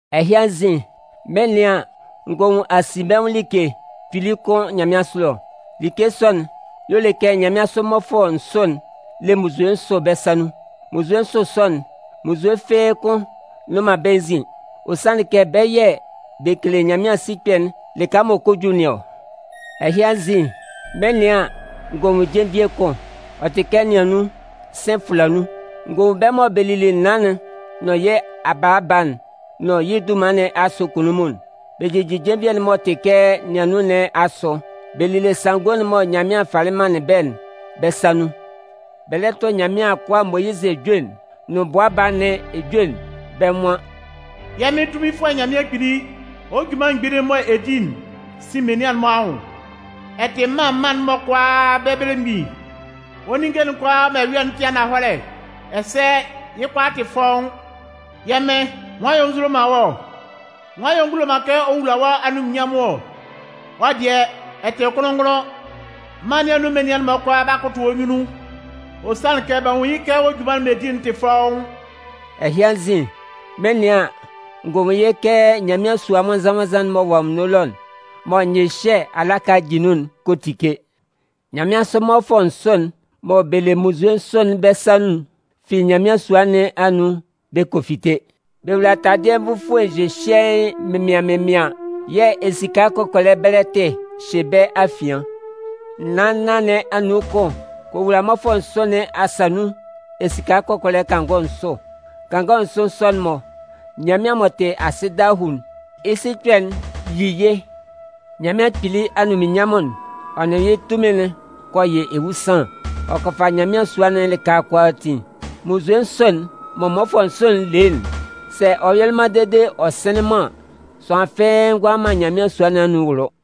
Ɛhɩ anzin, mɩn 'nɩan an, n gɔ nwun asinbɛnwʋn like kpili kʋn nyanmɩansʋ ɛlɔ. Like sɔ'n y'ɔ le kɛ nyanmɩansʋ mmɔfʋɛ nsʋ le munnzue nsʋ bɛ́ sa nun. Munnzue nsʋ sɔ'n, munnzue fɩ́ɩ́ kʋ́n nnʋn man bɛ́ nzin. Ɔ sanlɩn kɛ bɛ yɛ̂ bɛ kele Nyanmɩan sikpɛ'n lɩka m'ɔ kɔ ju nɩn ɔ. Ɛhɩ anzin, mɩn 'nɩan an, n gɔ nwun jenvie kʋn, ɔ tɩ kɛ niannun, sɩ̂n fʋla nun. N gɔ nwun bɛ́ mɔ bɛ lili naan'n nʋn yɩ́ abaaba'n nʋn yɩ́ dunman nɩn asʋ kunnunmun'n. Bɛ jijin jenvie'n m'ɔ tɩ kɛ niannun nɩn asʋ, bɛ lile sanngo'n mɔ Nyanmɩan falɩ manlɩn bɛ́'n bɛ́ sa nun. Bɛ lɛ tʋ Nyanmɩan akʋa Moyizɩ ejue'n nʋn Bʋa Baa nɩn ejue'n. Bɛ́ nwan: “Yɛ́ Mɩn Tunminfʋɛ Nyanmɩan Kpili, wɔ́ junman mgbili'n mɔ ɛ di'n sin menian'n-mɔ anwʋn! Ɛ tɩ mân mân'n-mɔ kʋalaa bɛ́ belemgbin. Wɔ́ ninnge'n kʋalaa mɔ ɛ yɔ'n tɩ ananhɔlɛ, ɛsɛ yɩ́ kʋalaa tɩ fɔ́ʋ́n. Yɛ́ Mɩn, nwan yɛ̂ ɔ nzulo man wɔ́ ɔ? Nwan yɛ̂ ɔ ngulo man kɛ ɔ wula wɔ́ anunminnyanmʋn ɔ? Wɔ́ dɩɛ, ɛ tɩ kʋnlʋn-ngʋnlʋn. Mân nɩn anun menian'n-mɔ kʋalaa 'ba kʋtʋ wɔ́ nyunnun. Ɔ sanlɩn kɛ b'a nwun yɩ́ kɛ wɔ́ junman'n mɔ ɛ di'n tɩ fɔ́ʋ́n.” Ɛhɩ anzin, mɩn 'nɩan an, n gɔ nwun yɩ́ kɛ Nyanmɩan sua nwannzan-nwannzan'n m'ɔ wɔ anwunno ɛlɔ, mɔ nyɩhyɛ alaka jin nun'n kɔ tike. Nyanmɩansʋ mmɔfʋɛ nsʋ'n mɔ bɛ le munnzue nsʋ'n bɛ́ sa nun'n fi Nyanmɩan sua nɩn anun bɛ kɔ fite. Bɛ wowula taladɩɛ nvufue nhyɩhyɩɛɩn mɩnmɩaɩn mɩnmɩaɩn yɛ̂ esika kɔkɔlɛ bɛlɛtɩ hyɩ bɛ́ afian. Naan nnan nɩn anun kʋn kɔ wowula mmɔfʋɛ nsʋ nɩn asa nun esika kɔkɔlɛ kangɔ nsʋ. Kangɔ nsʋ sɔ'n-mɔ, Nyanmɩan m'ɔ tɩ asɩ dahuu'n, yɩ́ sikpɛ'n yi yɩ́. Nyanmɩan Kpili anunminnyanmʋn'n, ɔ nʋn yɩ́ tunmin'n kɔ yɩ ewusanlan, ɔ kɔ fa Nyanmɩan sua'n lɩka kʋalaatin. Munnzue nsʋ'n mɔ mmɔfʋɛ nsʋ'n le'n, sɛ ɔ yɔlɩ man dede ɔ sɩnlɩn man an, sʋanlan fɩ́ɩ́ ngʋala man Nyanmɩan sua nɩn anun wʋlʋ.